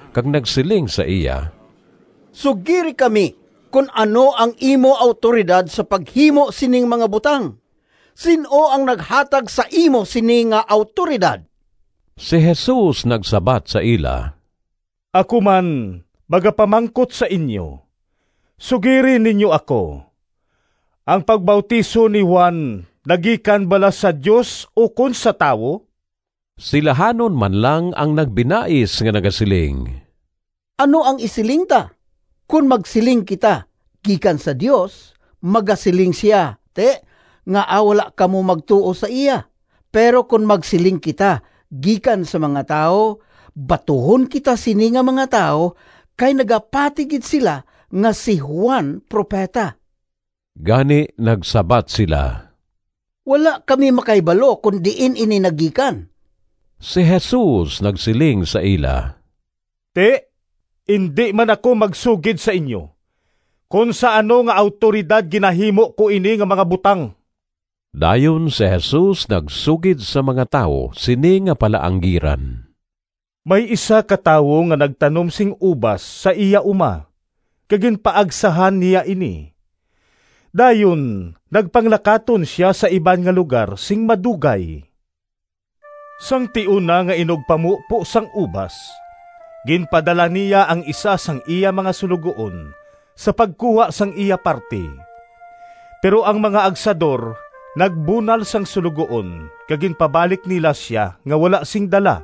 kag nagsiling sa iya, “Sugiri kami kon ano ang imo awtoridad sa paghimo sining mga butang? Sin-o ang naghatag sa imo sini nga awtoridad?” Si Jesus nagsabat sa ila, “Ako man magapamangkot sa inyo. Sugiri ninyo ako, ang pagbautiso ni Juan nagikan bala sa Dios ukon sa tawo?” Silahanon man lang ang nagbinais nga nagasiling, “Ano ang isiling ta? Kon magsiling kita, ‘Gikan sa Dios,’ magasiling sia, ‘Ti, ngaa wala kamo magtuo sa iya?’ Pero kon magsiling kita, ‘Gikan sa mga tawo,’ batuhon kita sini nga mga tawo, kay nagapati gid sila nga si Juan propeta.” Gani nagsabat sila, “Wala kami makahibalo kon diin ini nagikan.” Si Jesus nagsiling sa ila, “Ti, indi man ako magsugid sa inyo kon sa ano nga awtoridad ginahimo ko ini nga mga butang.” Dayon si Jesus nagsugid sa mga tawo sini nga palaanggiran, “May isa ka tawo nga nagtanom sing ubas sa iya uma kag ginpaagsahan niya ini. Dayon nagpanglakaton sia sa iban nga lugar sing madugay. Sang tion na nga inugpamupo sang ubas, ginpadala niya ang isa sang iya mga suloguon sa pagkuha sang iya parti. Pero ang mga agsador nagbunal sang suloguon kag ginpabalik nila sia nga wala sing dala.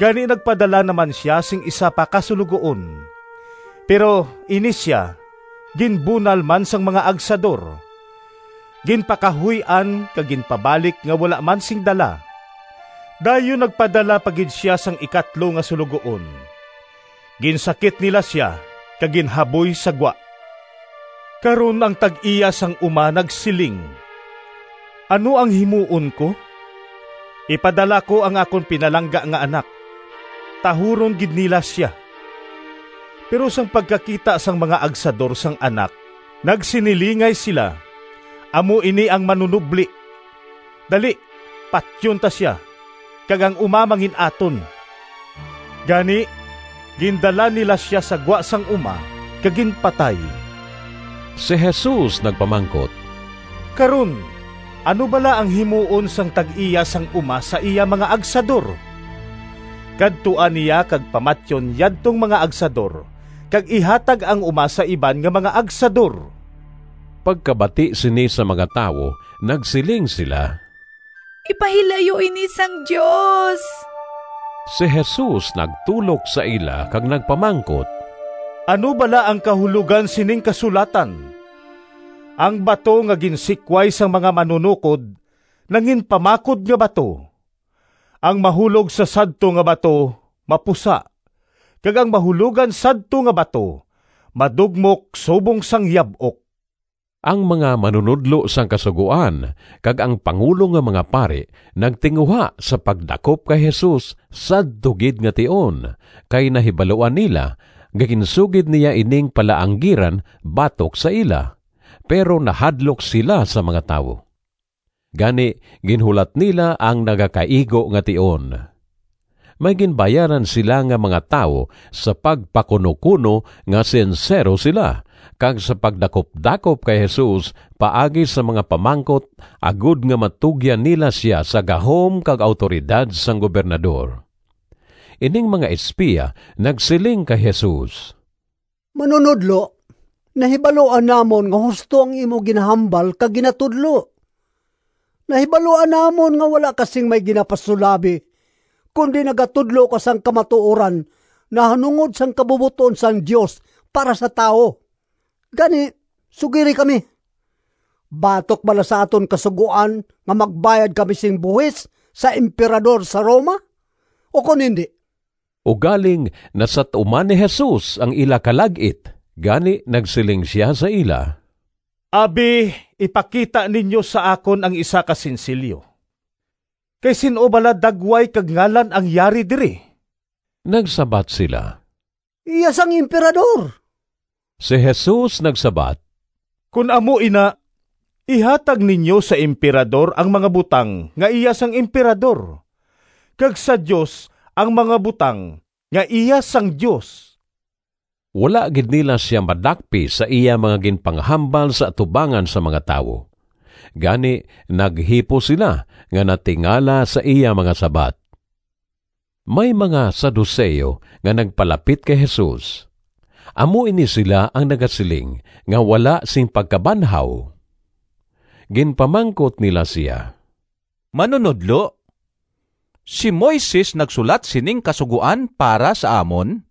Gani nagpadala na man sia sing isa pa ka suloguon, pero ini sia ginbunal man sang mga agsador, ginpakahuy-an kag ginpabalik nga wala man sing dala. Dayon nagpadala pa gid sia sang ikatlo nga suloguon. Ginsakit nila sia kag ginhaboy sa gwa. Karon ang tag-iya sang uma nagsiling, ‘Ano ang himuon ko? Ipadala ko ang akon pinalangga nga anak. Tahuron gid nila sia!’ Pero sang pagkakita sang mga agsador sang anak nagsinilingay sila, ‘Amo ini ang manunobli. Dali patyon ta sia kag ang uma mangin-aton.’ Gani gindala nila sia sa gwa sang uma kag ginpatay.” Si Jesus nagpamangkot, “Karon ano bala ang himuon sang tag-iya sang uma sa iya mga agsador? Kadtuan niya kag pamatyon yadtong mga agsador kag ihatag ang uma sa iban nga mga agsador.” Pagkabati sini sang mga tawo nagsiling sila, “Ipahilayo ini sang Dios.” Si Jesus nagtulok sa ila kag nagpamangkot, “Ano bala ang kahulogan sining kasulatan? ‘Ang bato Nga ginsikway sang mga manunokod Nanginpamakod nga bato.’ Ang mahulog sa sadto nga bato mapusa, kag ang mahulogan sadto nga bato madugmok subong sang yab-ok.” Ang mga manunodlo sang Kasugoan kag ang pangulo nga mga pari nagtinguha sa pagdakop kay Jesus sadto gid nga tion, kay nahibaluan nila nga ginsugid niya ining palaanggiran batok sa ila, pero nahadlok sila sa mga tawo. Gani ginhulat nila ang nagakaigo nga tion. May ginbayaran sila nga mga tawo sa pagpakunokuno nga sinsero sila, kag sa pagdakupdakop kay Jesus paagi sa mga pamangkot agod nga matugyan nila sia sa gahom kag awtoridad sang Gobernador. Ining mga espiya nagsiling kay Jesus, “Manunodlo, nahibaluan namon nga husto ang imo ginahambal kag ginatudlo. Nahibaluan namon nga wala ka sing may ginapasulabi, kundi nagatudlo ka sang kamatuoran nahanungod sang kabubot-on sang Dios para sa tawo. Gani sugiri kami, batok bala sa aton Kasugoan nga magbayad kami sing buhis sa Emperador sa Roma, ukon indi?” Ugaling nasat-uman ni Jesus ang ila kalag-it, gani nagsiling sia sa ila, “Abi ipakita ninyo sa akon ang isa ka sinsilyo. Kay sin-o bala dagway kag ngalan ang yari diri?” Nagsabat sila, “Iya sang Emperador.” Si Jesus nagsabat, “Kon amo ina, ihatag ninyo sa Emperador ang mga butang nga iya sang Emperador, kag sa Dios ang mga butang nga iya sang Dios.” Wala gid nila sia madakpi sa iya mga ginpanghambal sa atubangan sang mga tawo, gani naghipos sila nga natingala sa iya mga sabat. May mga Saduceo nga nagpalapit kay Jesus. (Amo ini sila ang nagasiling nga wala sing pagkabanhaw.) Ginpamangkot nila sia, “Manunodlo, si Moises nagsulat sining kasugoan para sa amon,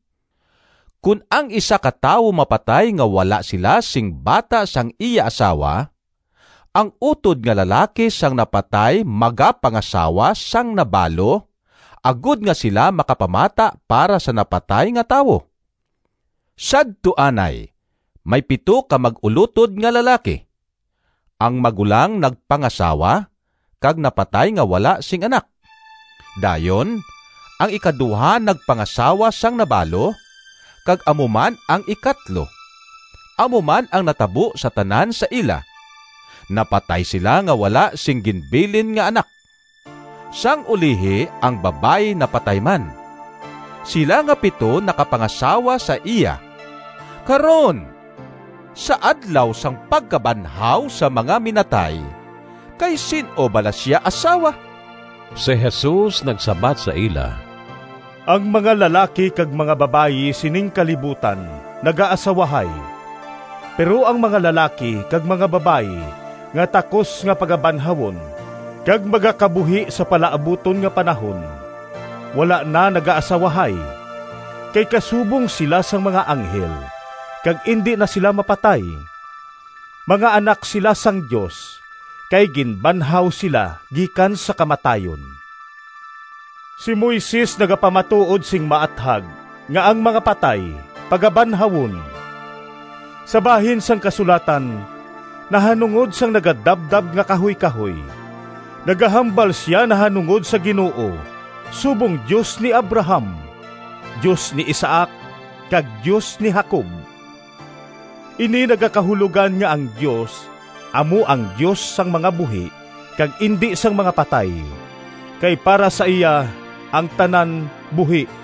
‘Kon ang isa ka tawo mapatay nga wala sila sing bata sang iya asawa, ang utod nga lalaki sang napatay magapangasawa sang nabalo agod nga sila makapamata para sa napatay nga tawo.’ Sadto anay may pito ka mag-ulotod nga lalaki. Ang magulang nagpangasawa, kag napatay nga wala sing anak. Dayon ang ikaduha nagpangasawa sang nabalo, kag amo man ang ikatlo. Amo man ang natabo sa tanan sa ila. Napatay sila nga wala sing ginbilin nga anak. Sang ulihi ang babayi napatay man. Sila nga pito nakapangasawa sa iya. Karon, sa adlaw sang pagkabanhaw sang mga minatay, kay sin-o bala sia asawa?” Si Jesus nagsabat sa ila, “Ang mga lalaki kag mga babayi sining kalibutan nagaasawahay, pero ang mga lalaki kag mga babayi nga takos nga pagabanhawon kag magakabuhi sa palaabuton nga panahon wala na nagaasawahay. Kay kasubong sila sang mga anghel kag indi na sila mapatay. Mga anak sila sang Dios, kay ginbanhaw sila gikan sa kamatayon. Si Moises nagapamatuod sing maathag nga ang mga patay pagabanhawon. Sa bahin sang kasulatan nahanungod sang nagadabdab nga kahuykahoy, nagahambal sia nahanungod sa Ginoo subong ‘Dios ni Abraham, Dios ni Isaac, kag Dios ni Jacob.’ Ini nagakahulogan nga ang Dios amo ang Dios sang mga buhi kag indi sang mga patay, kay para sa iya ang tanan buhi.”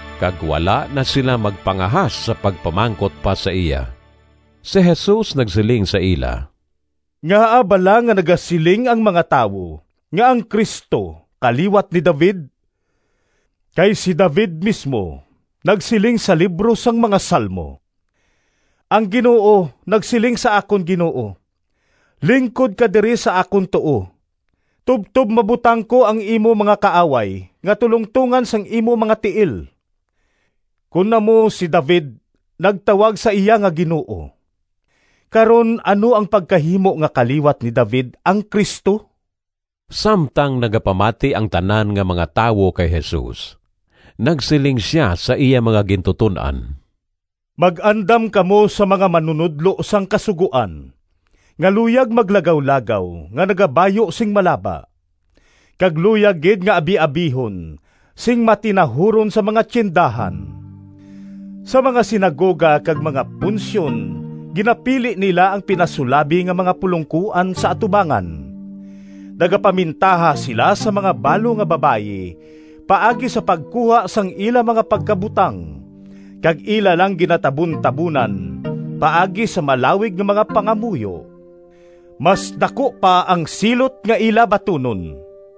Kag wala na sila magpangahas sa pagpamangkot pa sa iya. Si Jesus nagsiling sa ila, “Ngaa bala nga nagasiling ang mga tawo nga ang Cristo kaliwat ni David? Kay si David mismo nagsiling sa libro sang mga Salmo: ‘Ang Ginoo nagsiling sa akon Ginoo, Lingkod ka diri sa akon tuo, Tubtob mabutang ko Ang imo mga kaaway Nga tulongtongan sang imo mga tiil.’ Kon amo si David nagtawag sa iya nga ‘Ginoo.’ Karon ano ang pagkahimo nga kaliwat ni David ang Cristo?” Samtang nagapamati ang tanan nga mga tawo kay Jesus, nagsiling sia sa iya mga gintuton-an, “Mag-andam kamo sa mga manunodlo sang Kasugoan, nga luyag maglagawlagaw nga nagabayu sing malaba, kag luyag gid nga abiabihon sing matinahuron sa mga tiyendahan. Sa mga sinagoga kag mga punsyon ginapili nila ang pinasulabi nga mga pulongkoan sa atubangan. Nagapamintaha sila sa mga balo nga babayi paagi sa pagkuha sang ila mga pagkabutang kag ila lang ginatabuntabonan paagi sa malawig nga mga pangamuyo. Mas daku pa ang silot nga ila batunon!”